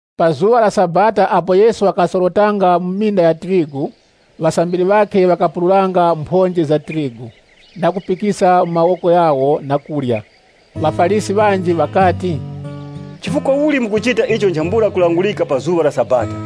Pa zuŵa la Sabata apo Yesu wakasorotanga mu minda ya tirigu, ŵasambiri ŵakhe ŵakapururanga mphonje za tirigu, na kupikisa mu mawoko ghawo na kurya. ŴaFarisi ŵanji ŵakati, “Chifukwa uli mukuchita icho nchambula kulangurika pa zuŵa la Sabata?”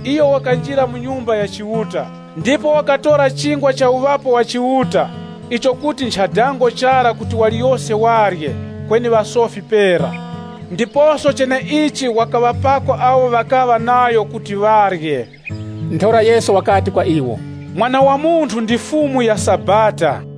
Iyo wakanjira mu Nyumba ya Chiuta, ndipo wakatora Chingwa cha Uŵapo wa Chiuta icho kuti ncha dango chara kuti waliyose warye, kweni ŵasofi pera. Ndiposo cheneichi wakaŵapako awo ŵakaŵa nayo kuti ŵarye.” Ntheura Yesu wakati kwa iwo, “Mwana wa Munthu ndi Fumu ya Sabata.”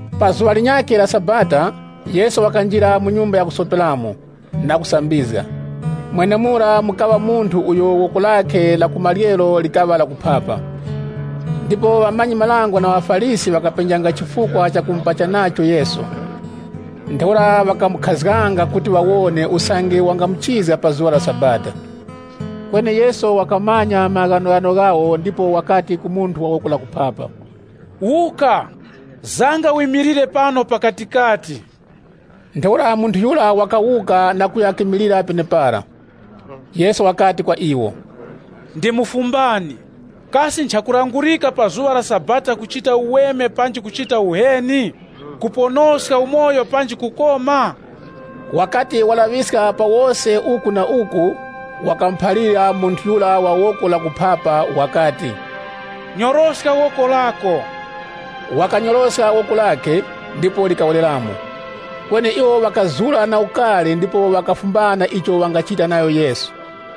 Pa zuŵa linyakhe la Sabata, Yesu wakanjira mu nyumba ya kusoperamo, na kusambizga. Mwenemura mukaŵa munthu uyo woko lakhe la ku maryero likaŵa la kuphapa. Ndipo ŵamanyi-marango na ŵaFarisi ŵakapenjanga chifukwa chakumupacha nacho Yesu. Ntheura ŵakamukhazganga kuti ŵawone usange wangamuchizga pa zuŵa la Sabata. Kweni Yesu wakamanya maghanoghano ghawo ndipo wakati ku munthu wa woko la kuphapa, “Wuka, zanga wimilire pano pakatikati.” Ntheura munthu yura wakawuka na kuya kimilira penepara. Yesu wakati kwa iwo, “Ndimufumbani, kasi nchakulangurika pa zuŵa la Sabata kuchita uweme panji kuchita uheni? Kuponoska umoyo panji kukoma?” Wakati walaŵiska pa wose uku na uku, wakamuphalira munthu yura wa woko la kuphapa wakati, “Nyoroska woko lako.” Wakanyoroska woko lakhe, ndipo likawereramo. Kweni iwo ŵakazura na ukari ndipo ŵakafumbana icho ŵangachita nayo Yesu.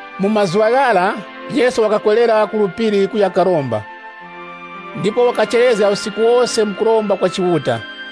Mu mazuŵa ghara, Yesu wakakwerera ku phiri kuya karomba. Ndipo wakacherezga usiku wose mu kuromba kwa Chiuta.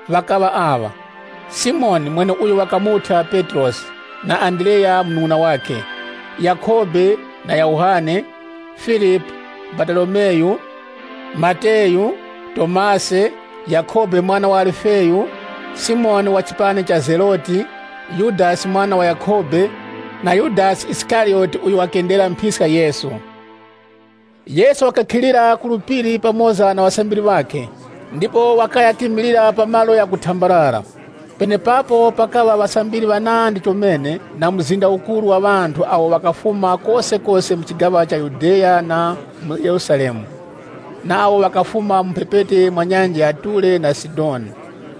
Ŵakaŵa aŵa: Simoni (mweneuyo wakamuthya Petrosi) na Andreya munung'una wakhe, Yakhobe na Yohane, Filipu, Baratolomeyu. Mateyu, Tomasi, Yakhobe mwana wa Alifeyu, Simoni wa chipani cha Zeloti. Yudasi mwana wa Yakhobe, na Yudasi Isikariyoti uyo wakendera mphiska Yesu. Yesu wakakhira mu phiri pamoza na ŵasambiri ŵakhe, ndipo wakaya kimilira pa malo ghakuthenga. Penepapo pakaŵa ŵasambiri ŵanandi chomene, na mzinda ukuru wa ŵanthu awo ŵakafuma kosekose mu chigaŵa cha Yudeya na mu Yerusalemu, na awo ŵakafuma mu mphepete mwa nyanja ya Ture na Sidoni.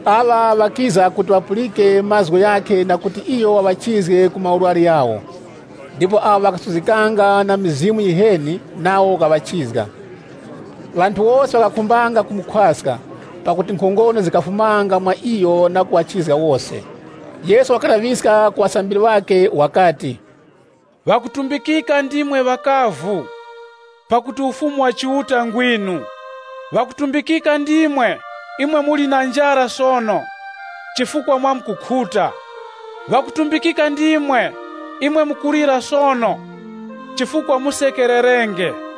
Aŵa ŵakiza kuti ŵapulike mazgu ghakhe na kuti iyo waŵachizge ku maurwari ghawo. Ndipo awo ŵakasuzgikanga na mizimu yiheni, nawo wakaŵachizga. Ŵanthu wose ŵakakhumbanga kumukhwaska, pakuti nkhongono zikafumanga mwa iyo na kuŵachizga wose. Yesu wakalaŵiska ku ŵasambiri ŵakhe wakati, “Ŵakutumbikika ndimwe ŵakavu, pakuti Ufumu wa Chiuta ngwinu!” “Ŵakutumbikika ndimwe, imwe muli na njara sono, chifukwa mwamkukhuta!” “Ŵakutumbikika ndimwe, imwe mukulira sono, chifukwa musekererenge!”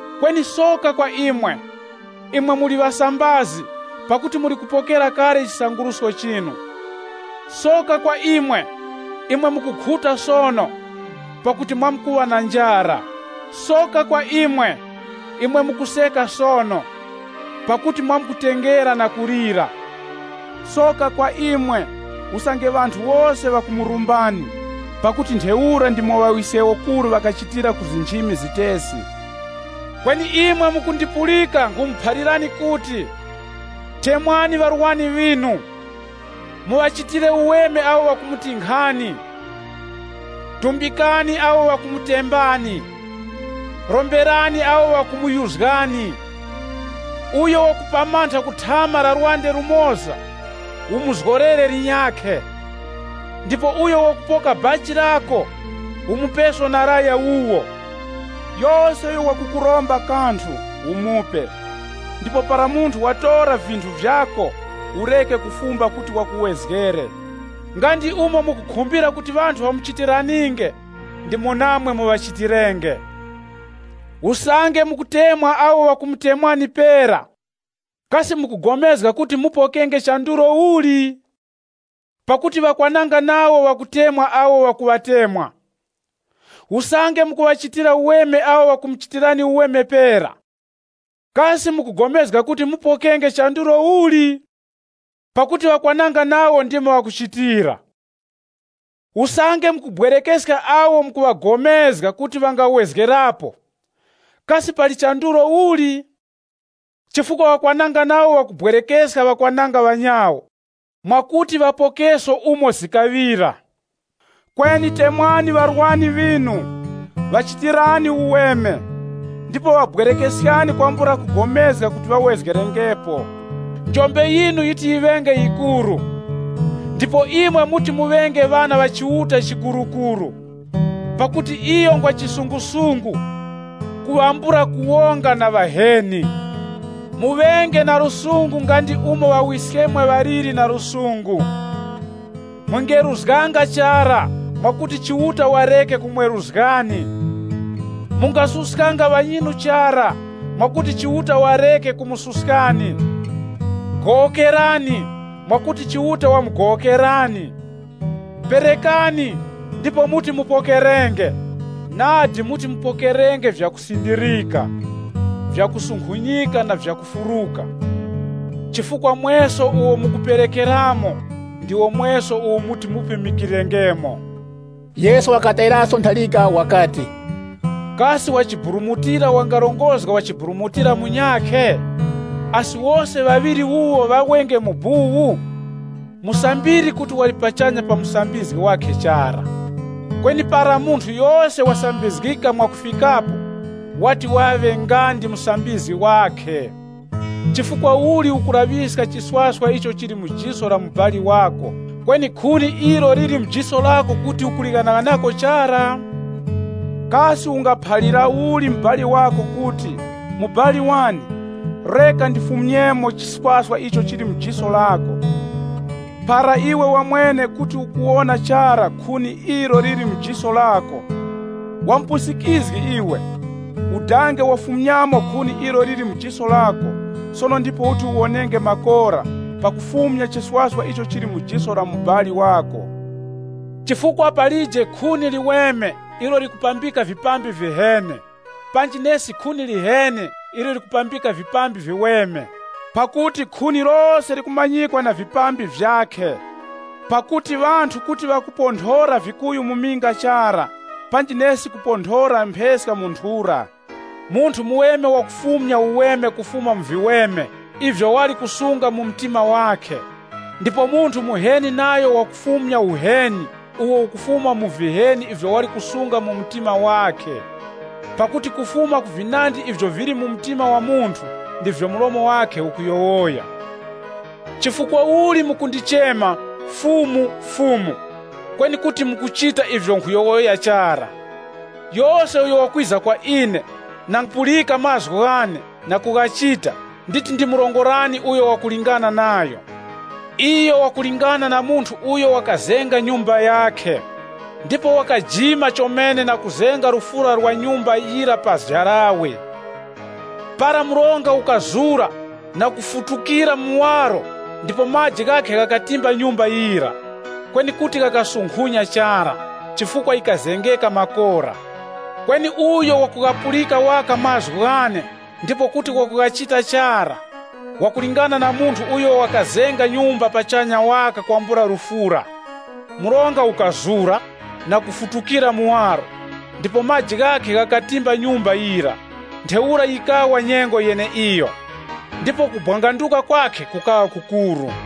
“Kweni soka kwa imwe, imwe muli ŵasambazi pakuti muli kupokera kale chisangurusko chinu!” “Soka kwa imwe, imwe mukukhuta sono! Pakuti mwamkuŵa na njara. Soka kwa imwe, imwe mukuseka sono, pakuti mwamkutengera na kulira!” “Soka kwa imwe, usange ŵanthu wose ŵakumurumbani, pakuti ntheura ndimo ŵawiskewokuru ŵakachitira ku nchimi zitesi.” “Kweni imwe mukundipulika nkhumuphalirani kuti, temwani ŵarwani ŵinu, muŵachitire uweme awo ŵakumutinkhani. Tumbikani awo ŵakumutembani, romberani awo ŵakumuyuzgani. Uyo wakupamantha ku thama la lwande lumoza, umuzgorere linyakhe. Ndipo uyo wakupoka bachi lako, umupeso na laya wuwo. Yose uyo wakukuromba kanthu, umupe. Ndipo para munthu watora vinthu vyako, ureke kufumba kuti wakuwezgere. Nga ndi umo mukukhumbira kuti ŵanthu ŵamuchitiraninge, ndimo namwe muŵachitirenge.” “Usange mukutemwa awo ŵakumutemwani pera, kasi mukugomezga kuti mupokenge chandulo uli? Pakuti ŵakwananga nawo ŵakutemwa awo ŵakuŵatemwa. Usange mukuŵachitira uweme awo ŵakumuchitirani uweme pera, kasi mukugomezga kuti mupokenge chandulo uli? Pakuti ŵakwananga nawo ndimo ŵakuchitira. Usange mukubwerekeska awo mukuŵagomezga kuti ŵangawezgerapo, kasi pali chandulo uli? Chifukwa ŵakwananga nawo ŵakukongoreska ŵakwananga ŵanyawo mwakuti ŵapokeso umo zikaŵira. Kweni temwani ŵarwani ŵinu, ŵachitirani uweme, ndipo ŵabwerekeskani kwambula kugomezga kuti ŵawezgerengepo. Njombe yinu yiti yiŵenge yikuru, ndipo imwe muti muŵenge ŵana ŵa Chiuta Chikurukuru. Pakuti iyo ngwa lusungu ku ŵambula kuwonga na ŵaheni. Muŵenge na lusungu nga ndi umo Ŵawiskemwe ŵaliri na lusungu.” “Mungeruzganga chara, mwakuti Chiuta wareke kumweruzgani. Mungasuskanga ŵanyinu chara, mwakuti Chiuta wareke kumususkani. Gowokerani, mwakuti Chiuta wamugowokerani. Perekani, ndipo muti mupokerenge. Nadi muti mupokerenge vya kusindirika, vyakusunkhunyika na vyakufuruka. Chifukwa mweso uwo mukuperekerapo, ndiwo mweso uwo muti mupimikirengemo.” Yesu wakaŵatayiraso ntharika wakati, “Kasi wachiburumutira wangarongozga wa chiburumutira munyakhe? Asi wose ŵaŵiri wuwo ŵawenge mu buwu? Musambiri kuti wali pachanya pa musambizgi wakhe chara. Kweni para munthu yose wasambizgika mwakufikapo, wati waŵe nga ndi musambizgi wakhe.” “Chifukwa uli ukulaŵiska chiswaswa icho chili mu jiso la mubali wako, kweni khuni ilo liri mu jiso lako kuti ukulighanaghanako chara? Kasi ungaphalira uli mubali wako kuti, ‘Mubali wane, reka ndifumyemo chiswaswa icho chili mu jiso lako,’ para iwe wamwene kuti ukuwona chara khuni ilo liri mu jiso lako? Wamupusikizgi iwe, udange wafumyamo khuni ilo liri mu jiso lako sono ndipo uti uwonenge makora pakufumya chiswaswa icho chili mu jiso la mubali wako.” “Chifukwa palije khuni liweme ilo likupambika vipambi viheni, panji nesi khuni liheni ilo likupambika vipambi viweme. Pakuti khuni lose likumanyikwa na vipambi vyakhe. Pakuti ŵanthu kuti ŵakuponthora vikuyu mu minga chara, panji nesi kuponthora mpheska mu nthura. Munthu muweme wakufumya uweme kufuma mu viweme ivyo wali kusunga mu mtima wakhe. Ndipo munthu muheni nayo wakufumya uheni uwo ukufuma mu viheni ivyo wali kusunga mu mtima wakhe, pakuti kufuma ku vinandi ivyo vili mu mtima wa munthu, ndivyo mlomo wakhe ukuyowoya.” “Chifukwa uli mukundichema, ‘Fumu, Fumu,’ kweni kuti mukuchita ivyo nkhuyowoya chara? Yose uyo wakwiza kwa ine, na kupulika mazgu ghane, na kughachita, nditi ndimurongorani uyo wakulingana nayo. Iyo wakulingana na munthu uyo wakazenga nyumba yakhe, ndipo wakajima chomene na kuzenga lufura lwa nyumba yira pa jarawe. Para mronga ukatura na kufutukira muwaro ndipo maji ghakhe ghakatimba nyumba yira, kweni kuti ghakasunkhunya chara, chifukwa yikazengeka makora. Kweni uyo wakughapulika waka mazgu ghane ndipo kuti wakughachita chara, wakulingana na munthu uyo wakazenga nyumba pachanya waka kwambula lufura. Mronga ukatura na kufutukira muwaro, ndipo maji ghakhe ghakatimba nyumba yira, ntheura yikawa nyengo yeneiyo. Ndipo kubwanganduka kwakhe kukaŵa kukuru.”